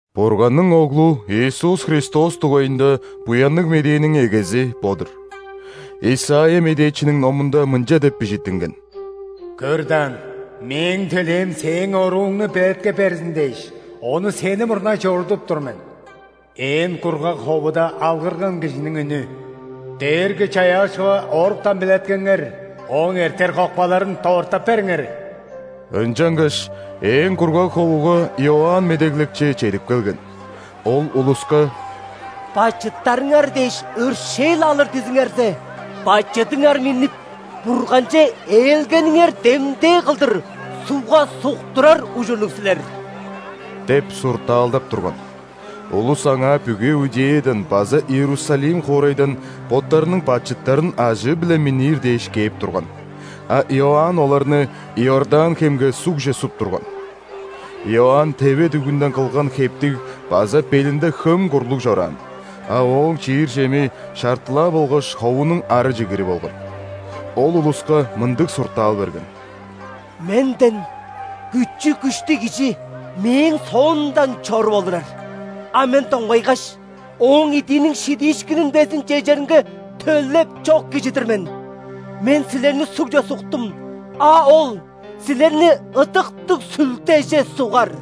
Бурганның Оглу Иисус Христос дугайында Буянныг Медээниң эгези бо-дур. Исайя медээчиниң номунда мынча деп бижиттинген:«Көр даан, Мээң төлээм Сээң орууңну белеткеп берзин дээш,ону Сени мурнай чорудуп тур мен». «Ээн кургаг ховуда алгырган кижиниң үнү:„Дээрги-Чаяакчыга оруктан белеткеңер!Ооң эртер кокпаларын дорттап бериңер“». Ынчангаш ээн кургаг ховуга Иоанн Медеглекчи чедип келген. Ол улуска: «Бачыттарыңар дээш өршээл алыр дизиңерзе, бачыдыңар миннип, Бурганче ээлгениңер демдээ кылдыр ·сугга суктурар ужурлуг силер» – деп суртаалдап турган. Улус аңаа бүгү Иудеядан база Иерусалим хоорайдан боттарының бачыттарын ажыы-биле миннир дээш кээп турган, а Иоанн оларны Иордан хемге сугже суп турган. Иоанн теве дүгүнден кылган хептиг база белинде хөм курлуг чораан, а ооң чиир чеми шартылаа болгаш ховунуң ары чигири болган. Ол улуска мындыг суртаал берген: «Менден күчү-күштүг Кижи мээң соомдан чоруп олурар. А мен доңгайгаш, Ооң идииниң шидиишкинин безин чежеринге төлеп чок кижи-дир мен. Мен силерни сугже суктум, а Ол силерни Ыдыктыг Сүлдеже сугар».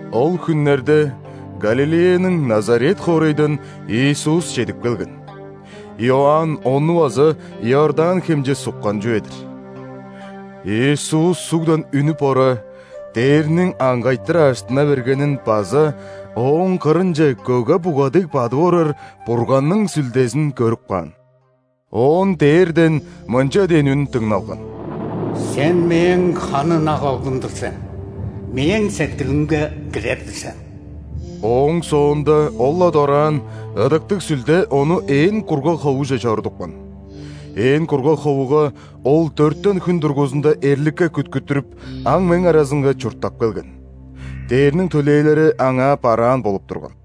Ол хүннерде Галилеяның Назарет хоорайдан Иисус чедип келген. Иоанн Ону база Иордан хемче суккан чүве-дир. Иисус сугдан үнүп ора, дээрниң аңгайтыр ажыттына бергенин база Ооң кырынче көге-буга дег бадып орар Бурганның Сүлдезин көрүп каан. Оон дээрден мынча дээн үн дыңналган: «Сен Мээң ханы ынак Оглум-дур сен, Мээң сеткилимге кирер-дир сен». Ооң соонда ол-ла дораан Ыдыктыг Сүлде Ону ээн кургаг ховуже чорудупкан. Ээн кургаг ховуга Ол дөртен хүн дургузунда эрликке күткүттүрүп, аң-мең аразынга чурттап келген. Дээрниң төлээлери Аңаа бараан болуп турган.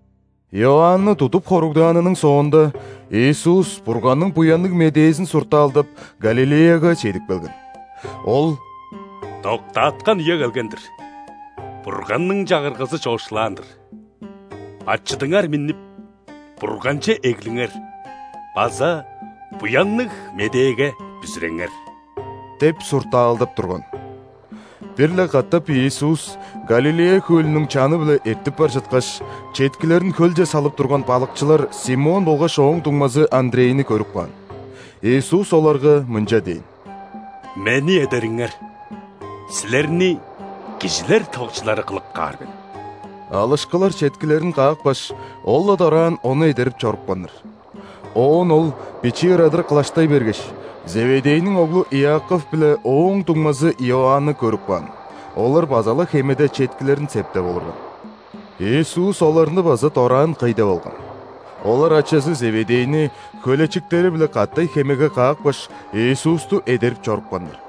Иоанны тудуп хоругдаанының соонда, Иисус Бурганның Буянныг Медээзин суртаалдап, Галилеяга чедип келген. Ол: «Доктааткан үе келген-дир, Бурганның Чагыргазы чоокшулаан-дыр: бачыдыңар миннип, Бурганче эглиңер база Буянныг Медээге бүзүреңер!» – деп суртаалдап турган. Бир-ле катап Иисус Галилея хөлүнүң чаны-биле эртип бар чыткаш, четкилерин хөлче салып турган балыкчылар Симон болгаш ооң дуңмазы Андрейни көрүп каан. Иисус оларга мынча дээн: «Мени эдериңер. Силерни кижилер тывыкчылары кылып каар мен». Алышкылар четкилерин каапкаш, ол-ла дораан Ону эдерип чорупканнар. Оон Ол бичии ырадыр кылаштай бергеш, Зеведейниң оглу Иаков биле ооң дуңмазы Иоанны көрүп каан, олар база-ла хемеде четкилерин септеп олурган. Иисус оларны база дораан кый деп алган. Олар ачазы Зеведейни хөлечиктери-биле катай хемеге каапкаш, Иисусту эдерип чорупканнар.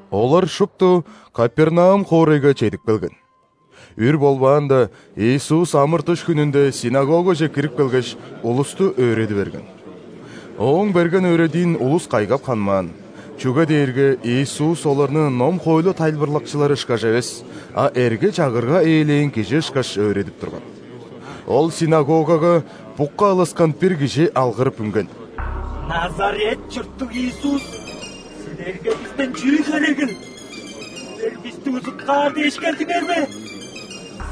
Олар шупту Капернаум хоорайга чедип келген. Үр болбаанда, Иисус ·амыр-дыш хүнүнде ·синагогаже кирип келгеш, улусту өөреди берген. Ооң берген өөредиин улус кайгап ханмаан, чүге дээрге Иисус оларны ном-хоойлу тайылбырлакчылары ышкаш эвес, а эрге-чагырга ээлээн кижи ышкаш өөредип турган. Ол ·синагогага букка алыскан бир кижи алгырып үнген: «Назарет чурттуг Иисус, Силерге бистен чүү херегил? Силер бисти узуткаар дээш келдиңер бе?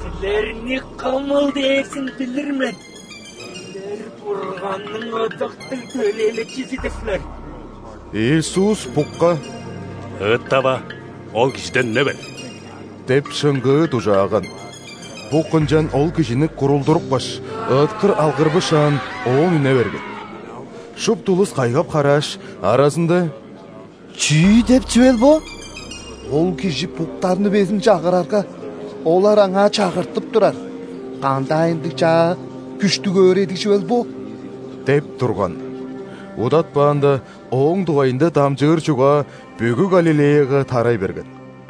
Силерни кымыл дээрзин билир мен, Силер – Бурганның Ыдыктыг Төлээлекчизи-дир силер!» Иисус букка: «Ыыттава, ол кижиден үне бер!» – деп шыңгыы дужааган. Бук ынчан ол кижини курулдурупкаш, ыыткыр алгырбышаан, оон үне берген. Шупту улус кайгап-харааш, аразында: «Чүү деп чүвел бо? Ол Кижи буктарны безин чагырарга, олар Аңаа чагыртып турар, кандаай ындыг чаа, күштүг өөредиг чүвел бо?» – деп турган. Удатпаанда Ооң дугайында дамчыыр чугаа бүгү Галилеяга тарай берген.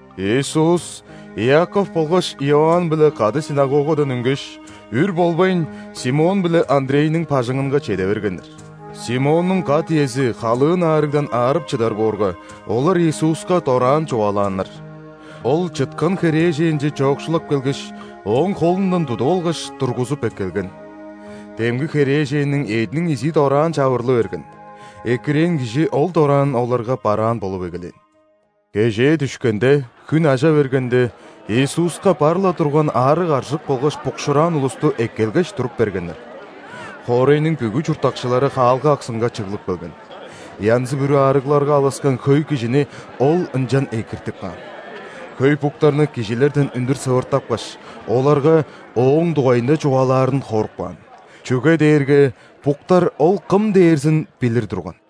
Иисус Иаков болгаш Иоанн-биле кады ·синагогадан үнгеш, үр болбайн, Симон биле Андрейниң бажыңынга чеде бергеннер. Симоннуң кат-иези халыын аарыгдан аарып чыдар боорга, олар Иисуска дораан чугаалааннар. Ол чыткан херээженче чоокшулап келгеш, ооң холундан тудуп алгаш, тургузуп эккелген. Демги херээженниң эъдиниң изии дораан чавырлы берген, экирээн кижи ол дораан оларга бараан болуп эгелээн. Кежээ дүшкенде, хүн ажа бергенде, Иисуска бар-ла турган аарыг-аржык болгаш букшуураан улусту эккелгеш туруп бергеннер. Хоорайның бүгү чурттакчылары хаалга аксынга чыглып келген. Янзы-бүрү аарыгларга алыскан хөй кижини Ол ынчан экиртип каан. Хөй буктарны кижилерден үндүр сывыртапкаш, оларга Ооң дугайында чугаалаарын хоруп каан, чүге дээрге буктар Ол кым дээрзин билир турган.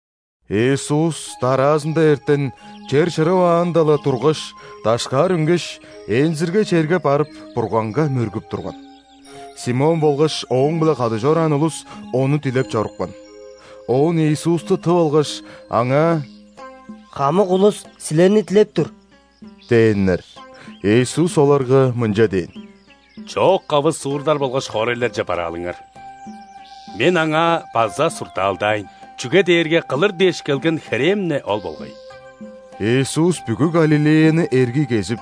Иисус дараазында эртен чер чырываанда-ла тургаш, дашкаар үнгеш, ээнзиргей черге барып, Бурганга мөргүп турган. Симон болгаш Ооң-биле кады чораан улус Ону дилеп чорупкан. Оон Иисусту тып алгаш, Аңаа: «Хамык улус Силерни дилеп тур» – дээннер. Иисус оларга мынча дээн: «Чоок-кавы суурлар болгаш хоорайларже бараалыңар, Мен аңаа база суртаалдаайн, чүге дээрге кылыр дээш келген херээм-не ол болгай!» Иисус бүгү Галилеяны эргий кезип,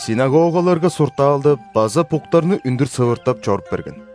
·синагогаларга суртаалдап база буктарны үндүр сывыртап чоруп берген.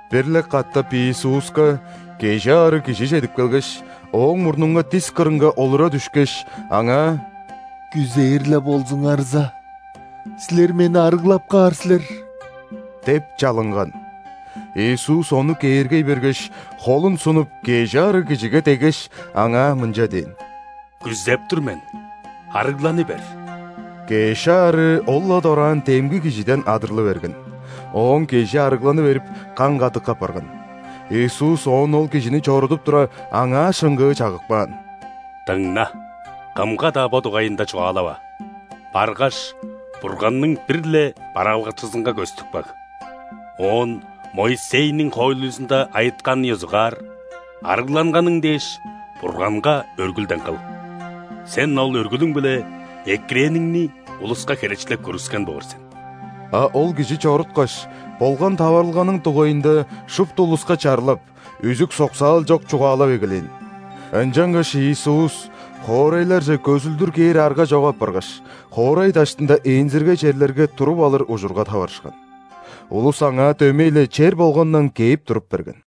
Бир-ле катап Иисуска кежи аарыг кижи чедип келгеш, Ооң мурнунга дис кырынга олура дүшкеш, Аңаа: «Күзээр-ле болзуңарза, Силер мени арыглап каар силер» – деп чалынган. Иисус ону кээргей бергеш, холун сунуп, кежи аарыг кижиге деггеш, аңаа мынча дээн: «Күзеп тур мен, арыгланы бер!» Кеш аарыы ол-ла дораан демги кижиден адырлы берген. Ооң кежи арыгланы берип, каң-кадык апарган. Иисус оон ол кижини чорудуп тура, аңаа шыңгыы чагып каан: «Дыңна, кымга-даа бо дугайында чугаалава. Баргаш, Бурганның бир-ле бараалгакчызынга көстүп каг, оон Моисейниң хоойлузунда айытканын ёзугаар, арыгланганың дээш, Бурганга өргүлден кыл. Сен ол өргүлүң-биле экирээниңни улуска херечилеп көргүскен боор сен». А ол кижи чоруткаш, болган таварылганың дугайында шупту улуска чарлап, үзүк-соксаал чок чугаалап эгелээн. Ынчангаш Иисус хоорайларже көзүлдүр кээр арга чок апаргаш, хоорай даштында ээнзиргей черлерге туруп алыр ужурга таварышкан. Улус Аңаа дөмей-ле чер болгандан кээп туруп берген.